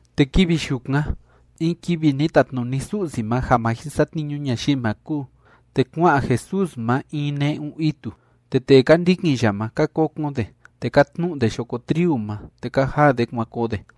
Te kivi yukan, in kivi ni tatnuni Su'si ma ja ma jin satniñu ñayii ma kúu, te kua'an Jesús ma in ne'un itu. Te tee ka ndikin ya ma, ka kokon de, te ka tnu'u de yoko triu ma, te ka jaa de kuan koo de.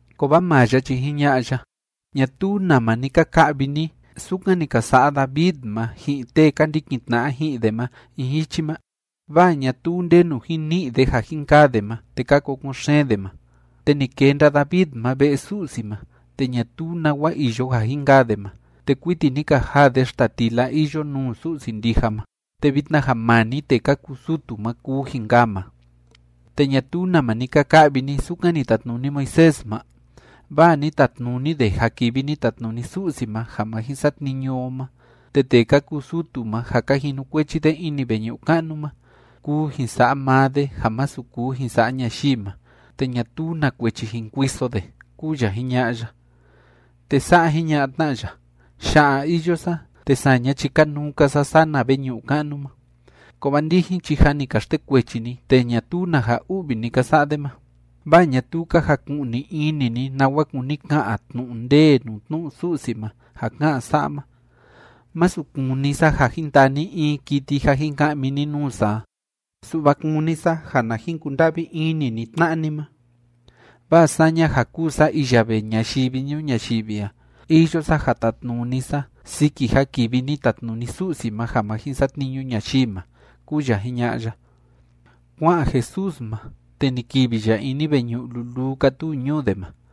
Kovaa maa ya chi jiña'a ya: ―¿Ñatuu nama ni ka ka'vi ni sukan ni ka sa'a David ma ji'in tee ka ndikin tna'a ji'in de ma in jichi ma? Vaa ñatuu ndenu jin ni'i de ja jin kaa de ma, te ka kokon xeen de ma. Te ni kenda David ma ve'e Su'si ma, te ñatuu nawa iyo ja jin kaa de ma, te kuiti ni ka jaa de xtatila iyo nuu Su'si ndija ma, te vitna ja maa‑ni tee ka kuu sutu ma kuu jin kaa ma. ¿Te ñatuu nama ni ka ka'vi ni sukan ni tatnuni Moisés ma? Vaa ni tatnuni de ja kivi ni tatnuni Su'si ma ja ma jin satniñu o ma, te tee ka kuu sutu ma ja ka jinukuechi de ini veñu'u ka'nu ma, kuu jin sa'a maa de ja masu kuu jin sa'a ñayii ma, te ñatuu na kuechi jin kuiso de ―kúu ya jiña'a ya. Te sa'a jiña'a tna ya: ―Ya'a iyo sa, te saña chi kanuu‑ka sa sana veñu'u ka'nu ma. Kovaa ndijin chi jâ ni ka xtekuechi ni tee ñatuu na ja u'vi ni ka sa'a de ma, vaa ñatuu ka jaku'ni ini ni nawa kúni ka'an tnu'u ndee nuu tnu'u Su'si ma ja ká'an sa'a ma: “Masu kúni sa ja jin taa ni in kiti ja jin ka'mi ni nuu sa a. Su'va kúni sa ja na jin kunda'vi ini ni tna'a ni ma.” Vaa saña ja kúu sa iya vee ñayivi ñuu ñayivi a, iyo sa ja tatnuni sa siki ja kivi ni tatnuni Su'si ma ja ma jin satniñu ñayii ma ―kúu ya jiña'a ya. Kua'an Jesús ma, te ni kivi ya ini veñu'u luluu kátuu ñuu de ma.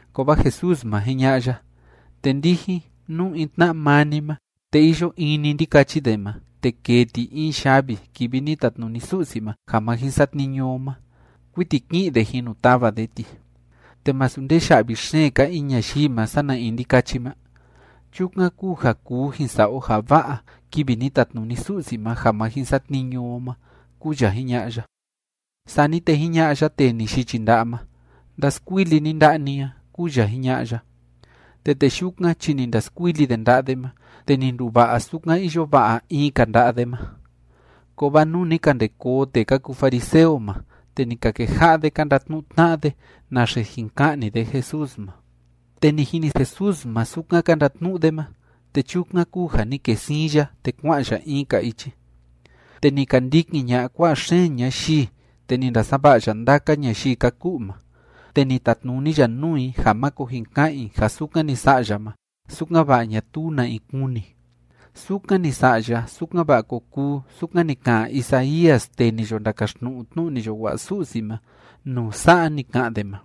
Kovaa Jesús ma, jiña'a ya: ―Te ndijin, nú in tna'a maa ni ma, te iyo in‑ni ndikachi de ma, te kêe ti in yavi kivi ni tatnuni Su'si ma ja ma jin satniñu o ma, kuiti ki'in de jin nu tava de ti. ¿Te masu ndee ya'vi xeen‑ka in ñayii ma sana in ndikachi ma? Chukan kúu ja kuu jin sa'a o ja va'a kivi ni tatnuni Su'si ma ja ma jin satniñu o ma ―kúu ya jiña'a ya. Sani te jiña'a ya tee ni yichi nda'a ma: ―Ndaskuili ni nda'a ni a ―kúu ya jiña'a ya. Te tee yukan chi ni ndaskuili de nda'a de ma, te ni nduva'a sukan iyo va'a in‑ka nda'a de ma. Kovaa nuu ni ka nde koo tee ka kuu fariseo ma, te ni ka keja'a de ka ndatnu'u tna'a de naxe jin ka'ni de Jesús ma. Te ni jini Jesús ma sukan ka ndatnu'u de ma, te chukan kúu ja ni kee siin ya, te kua'an ya in‑ka ichi. Te ni ka ndikin ña'a kua'a xeen ñayii, te ni ndasava'a ya ndaka ñayii ka ku'u ma. Te ni tatnuni ya nuu i ja máko jin ka'an i ja sukan ni sa'a ya ma, sukan‑va'a ñatuu na in kuni. Sukan ni sa'a ya, sukan‑va'a ko kuu sukan ni ka'an Isaías tee ni yo ndakaxtnu'u tnu'u ni yo wa'a Su'si ma nuu sa'a ni ka'an de ma: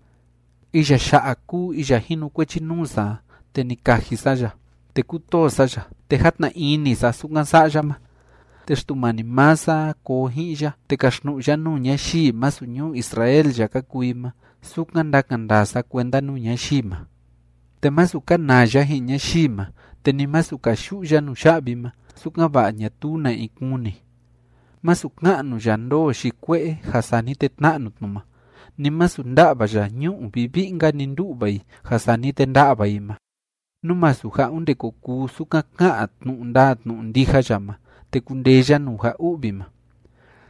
Iya ya'a kúu iya jinukuechi nuu sa a, te ni kaji sa ya, te kútoo sa ya, te játna ini sa sukan sa'a ya ma. Te Xtumani maa sa a koo ji'in ya, te kaxtnu'u ya nuu ñayii masu ñuu Israel ya ka kuu i ma sukan ndakan ndaa sa kuenda nuu ñayii ma. Te masu kanaa ya ji'in ñayii ma, te ni masu kayu'u ya nuya'vi ma, sukan‑va'a ñatuu na in kuni. Masu ka'nu ya ndoo yi kue'e ja sani te tna'nu tnu ma, ni masu nda'va ya ñu'u vivi'i‑nka‑ni ndu'va i ja sani te nda'va i ma, nú masu ja onde ko kuu sukan ká'an tnu'u ndaa tnu'u ndija ya ma, te kundee ya nuu ja u'vi ma.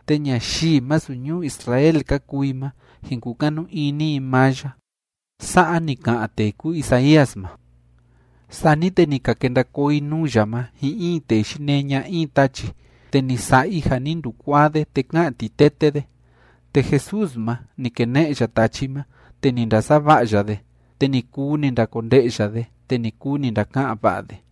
Te ñayii masu ñuu Israel ka kuu i ma, jin kukanu ini i maa ya. Sa'a ni ka'an tee kúu Isaías ma. Sani te ni ka kenda koo i nuu ya ma ji'in in tee yinee ña'a in tachi, te ni sa'a i ja ni ndukuaa de, te ká'an titete de. Te Jesús ma, ni kene'e ya tachi ma, te ni ndasava'a ya de, te ni kuu ni ndakonde'ya de, te ni kuu ni ndaka'an va'a de.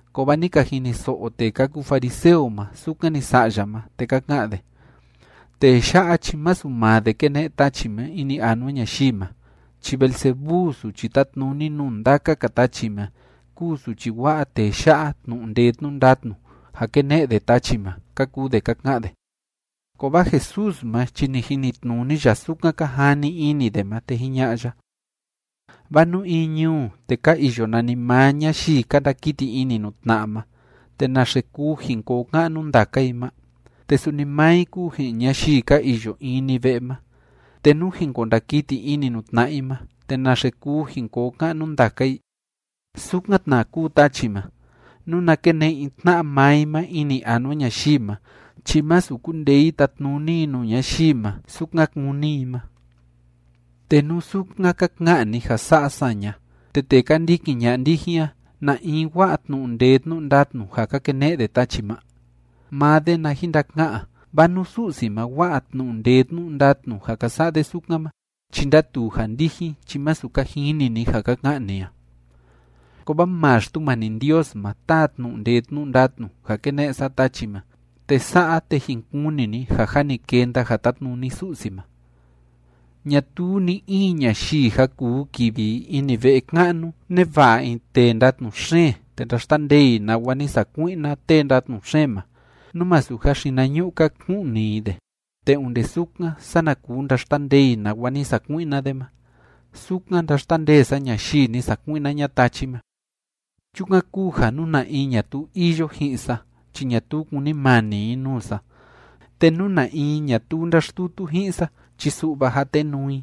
Kovaa ni ka jiniso'o tee ka kuu fariseo ma sukan ni sa'a ya ma, te ka ka'an de: ―Tee ya'a chi masu maa de kéne'e tachi ma ini anua ñayii ma. Chi Beelzebú suchi tátnuni nuu ndaka‑ka tachi ma kúu suchi wa'a tee ya'a tnu'u ndee tnu'u ndatnu ja kéne'e de tachi ma ―ka kuu de ka ka'an de. Kovaa Jesús ma chi ni jinitnuni ya sukan ka jani ini de ma, te jiña'a ya: ―Vaa nú in ñuu, te ka iyo nanimaa ñayii ka ndakiti ini nuu tna'a ma, te ¿naxe kuu jin koo ka'nu ndaka i ma? Te suni maa i kúu ji'in ñayii ka iyo in‑ni ve'e ma, te nú jin ko ndakiti ini nuu tna'a i ma, te ¿naxe kuu jin koo ka'nu ndaka i? Sukan tna kúu tachi ma, nuna kene'e i tna'a maa i ma ini anua ñayii ma chi masu kundee i tatnuni i nuu ñayii ma, sukan kúni i ma. ’Te nú sukan ka ka'an ni ja sa'a saña, ¿te tee ka ndikin ña'a ndijin a, na in wa'a tnu'u ndee tnu'u ndatnu ja ka kene'e de tachi ma? Maa de na jin ndaka'an, vaa nú Su'si ma wa'a tnu'u ndee tnu'u ndatnu ja ka sa'a de sukan ma, chi ndátuu ja ndijin chi masu ka jini ni ja ka ka'an ni a. Kovaa maa Xtumani Ndios ma táa tnu'u ndee tnu'u ndatnu ja kéne'e sa tachi ma. Te sa'a, te jin kuni ni ja jâ ni kenda ja tátnuni Su'si ma. ’Ñatuu ni‑in ñayii ja kuu kivi i ini ve'e ka'nu neva'a in tee ndatnu xeen te ndaxtandee i nawa ni sakui'na tee ndatnu xeen ma, nú masu ja xinañu'u‑ka ku'ni i de. Te onde sukan, sana kuu ndaxtandee i nawa ni sakui'na de ma. Sukan ndáxtandee sa ñayii ni sakui'na ña'a tachi ma. ’Chukan kúu ja nú na in ñatuu iyo ji'in sa chi ñatuu kúnimani i nuu sa, te nú na in ñatuu ndáxtutu ji'in sa, chi su'va jatenuu i.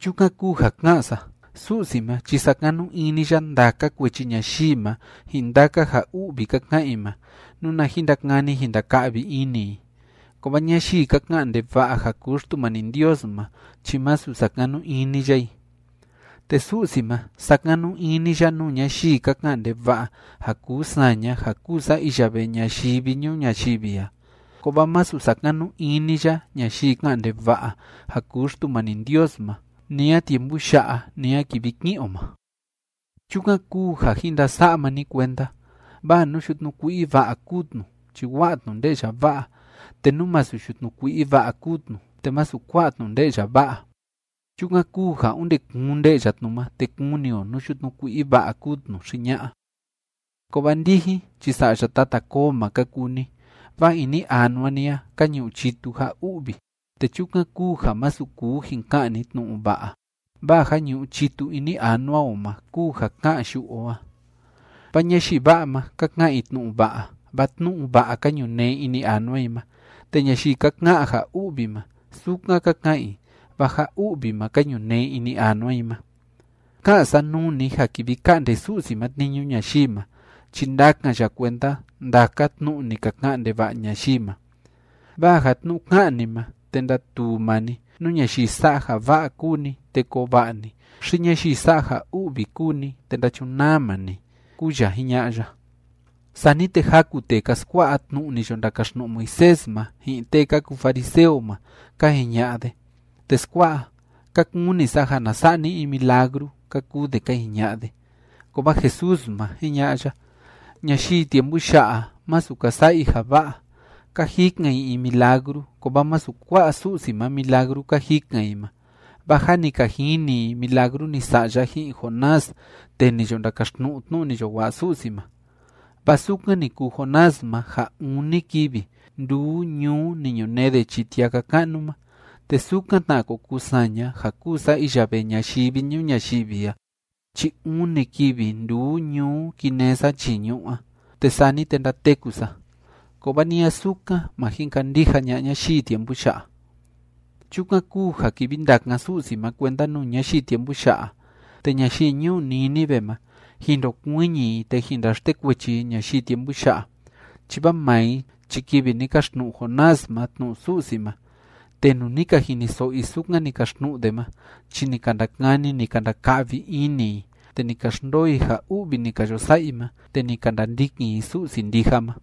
’Chukan kúu ja ká'an sa: Su'si ma chi sakanu ini ya ndaka kuechi ñayii ma ji'in ndaka ja u'vi ka ka'an i ma, nuna jin ndakani jin ndaka'vi ini i. Kovaa ñayii ka ka'an ndeva'a ja kuu Xtumani Ndios ma chi masu sakanu ini ya i. Te Su'si ma, sakanu ini ya nuu ñayii ka ka'an ndeva'a ja kuu saña ja kúu sa iya vee ñayivi ñuu ñayivi a, kovaa masu sakanu ini ya ñayii ká'an ndeva'a ja kuu Xtumani Ndios ma, ni a tiempu ya'a ni a kivi ki'in o ma. ’Chukan kúu ja jin ndasa'a maa ni kuenda. Vaa nú yutnu kui'i va'a kúu tnu, chi wa'a tnu nde'ya va'a. Te nú masu yutnu kui'i va'a kúu tnu, te masu kua'a tnu nde'ya va'a. Chukan kúu ja onde kuun nde'ya tnu ma, te kuni o nú yutnu kui'i va'a kúu tnu xi ña'a. ¡Kovaa ndijin chi sa'ya tata koo ma ka kuu ni! Vaa ini anua ni a ka ñu'u chitu ja u'vi, te chukan kúu ja masu kuu jin ka'an ni tnu'u va'a. Vaa ja ñu'u chitu ini anua o ma kúu ja ká'an yu'u o a. Vaa ñayii va'a ma, ka ka'an i tnu'u va'a, vaa tnu'u va'a ka ñunee ini anua i ma. Te ñayii ka ka'an ja u'vi ma, sukan ka ka'an i, vaa ja u'vi ma ka ñunee ini anua i ma. ’Ká'an sa nuu ni ja kivi ka'nde Su'si ma tniñu ñayii ma, chi ndakan ya kuenda ndaka tnu'u ni ka ka'an ndeva'a ñayii ma. Vaa ja tnu'u ká'an ni ma, te ndatuu maa ni nú ñayii sa'a ja va'a kúu ni te koo va'a ni xi ñayii sa'a ja u'vi kúu ni te ndachunaa maa ni ―kúu ya jiña'a ya. Sani te jaku tee ka skua'a tnu'u ni yo ndakaxtnu'u Moisés ma ji'in tee ka kuu fariseo ma, ka jiña'a de: ―Teskua'a, ka kuni sa ja na sa'a ni in milagru ―ka kuu de ka jiña'a de. Kovaa Jesús ma, jiña'a ya: ―Ñayii tiempu ya'a, masu ka sa'a i ja va'a. Ka jikan i in milagru, kovaa masu kua'a Su'si ma milagru ka jikan i ma, vaa jâ ni ka jini i milagru ni sa'a ya ji'in Jonás tee ni yo ndakaxtnu'u tnu'u ni yo wa'a Su'si ma. Vaa sukan ni kuu Jonás ma ja uni kivi nduu ñuu ni ñunee de chii tiaka ka'nu ma, te sukan tna ko kuu saña ja kúu sa iya vee ñayivi ñuu ñayivi a chi uni kivi nduu ñuu kinee sa chii ñu'ú a, te sani te ndateku sa, kovaa ni a sukan, ma jin kandija ña'a ñayii tiempu ya'a. Chukan kúu ja kivi ndakan Su'si ma kuenda nuu ñayii tiempu ya'a, te ñayii ñuu Nínive ma, jin ndokuiñi i, te jin ndaxtekuechi i ñayii tiempu ya'a, chi vaa maa i chi kivi ni kaxtnu'u Jonás ma tnu'u Su'si ma, te nuu ni ka jiniso'o i sukan ni kaxtnu'u de ma chi ni ka ndakani ni ka ndaka'vi ini i, te ni ka xndoo i ja u'vi ni ka yo sa'a i ma, te ni ka ndandikin i Su'si ndija ma.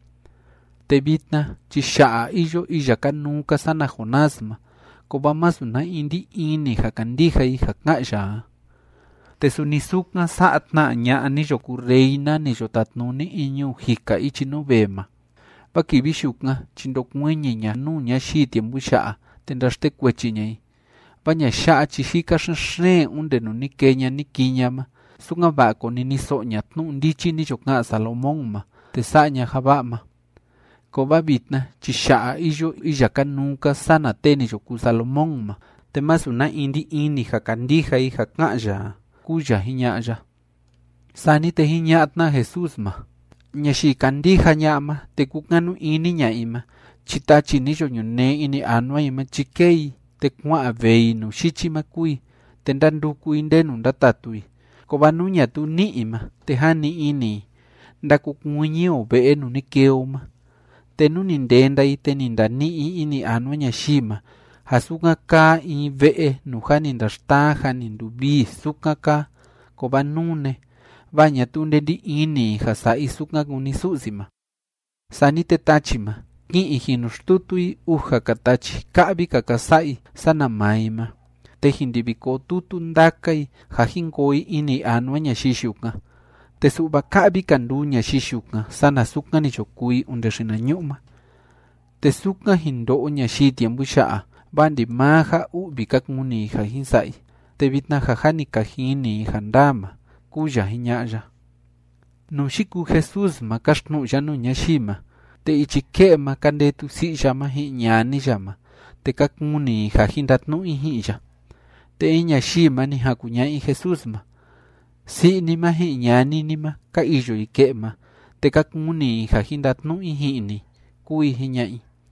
Te vitna chi ya'a iyo iya kanuu‑ka sana Jonás ma, kovaa masu na in ndí ini ja kandija i ja ká'an ya a. Te suni sukan sa'a tna ña'a ni yo kuu reina ni yo tatnuni in ñuu jika ichi nuu vee ma, vaa kivi yukan chi ndokuiñi ña nuu ñayii tiempu ya'a, te ndaxtekuechi ña i, vaa ña'a ya'a chi jika xen‑xeen onde nuu ni kee ña ni kii ña ma, sukan‑va'a koniniso'o ña tnu'u ndichi ni yo ka'an Salomón ma te sa'a ña ja va'a ma. Kovaa vitna chi ya'a iyo iya kanuu‑ka sana tee ni yo kuu Salomón ma, te masu na in ndí ini ja kandija i ja ká'an ya a ―kúu ya jiña'a ya. Sani te jiña'a tna Jesús ma: ―Ñayii kandija ña'a ma te kukanu ini ña'a i ma chi tachi ni yo ñunee ini anua i ma chi kée i, te kua'an vee i nuu yichi ma kúu i, te ndánduku i ndenu ndatatu i. Kovaa nú ñatuu ní'i i ma, te jani ini i: “Ndakokuiñi o ve'e nuu ni kee o ma.” Te nú ni ndenda i, te ni ndani'i i ini anua ñayii ma ja sukan kaa in ve'e nuu jâ ni ndaxtaa jâ ni nduvivii, sukan kaa, kovaa nune, vaa ñatuu nde ndí ini i ja sa'a i sukan kúni Su'si ma. Sani te tachi ma, ki'in i jin nu xtutu i uja‑ka tachi ka'vi‑ka ka sa'a i sana maa i ma, te jin ndivi koo tutu ndaka i ja jin koo i ini anua ñayii yukan, te su'va ka'vi‑ka nduu ñayii yukan sana sukan ni yo kuu i onde xinañu'u ma. Te sukan jin ndo'o ñayii tiempu ya'a, vaa ndimaa ja u'vi ka kuni i ja jin sa'a i, te vitna ja jâ ni ka jini i ja ndaa ma ―kúu ya jiña'a ya. Nuu yikuu Jesús ma káxtnu'u ya nuu ñayii ma, te ichi ke'e ma ka ndetu si'i ya ma ji'in ñani ya ma, te ka kuni i ja jin ndatnu'u i ji'in ya. Te in ñayii ma, ni jan kuña'a i Jesús ma: ―Si'i ni ma ji'in ñani ni ma, ka iyo i ke'e ma, te ka kuni i ja jin ndatnu'u i ji'in ni ―kúu i jiña'a i.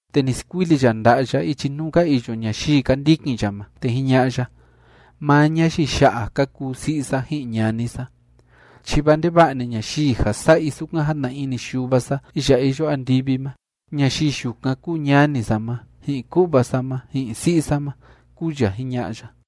Te ni skuili ya nda'a ya ichi nuu ka iyo ñayii ka ndikin ya ma, te jiña'a ya: ―Maa ñayii ya'a ka kuu si'i sa ji'in ñani sa, chi vaa ndeva'a‑ni ñayii ja sa'a i sukan játna ini Yuva sa iya iyo andivi ma, ñayii yukan kúu ñani sa ma, ji'in ku'va sa ma, ji'in si'i sa ma ―kúu ya jiña'a ya.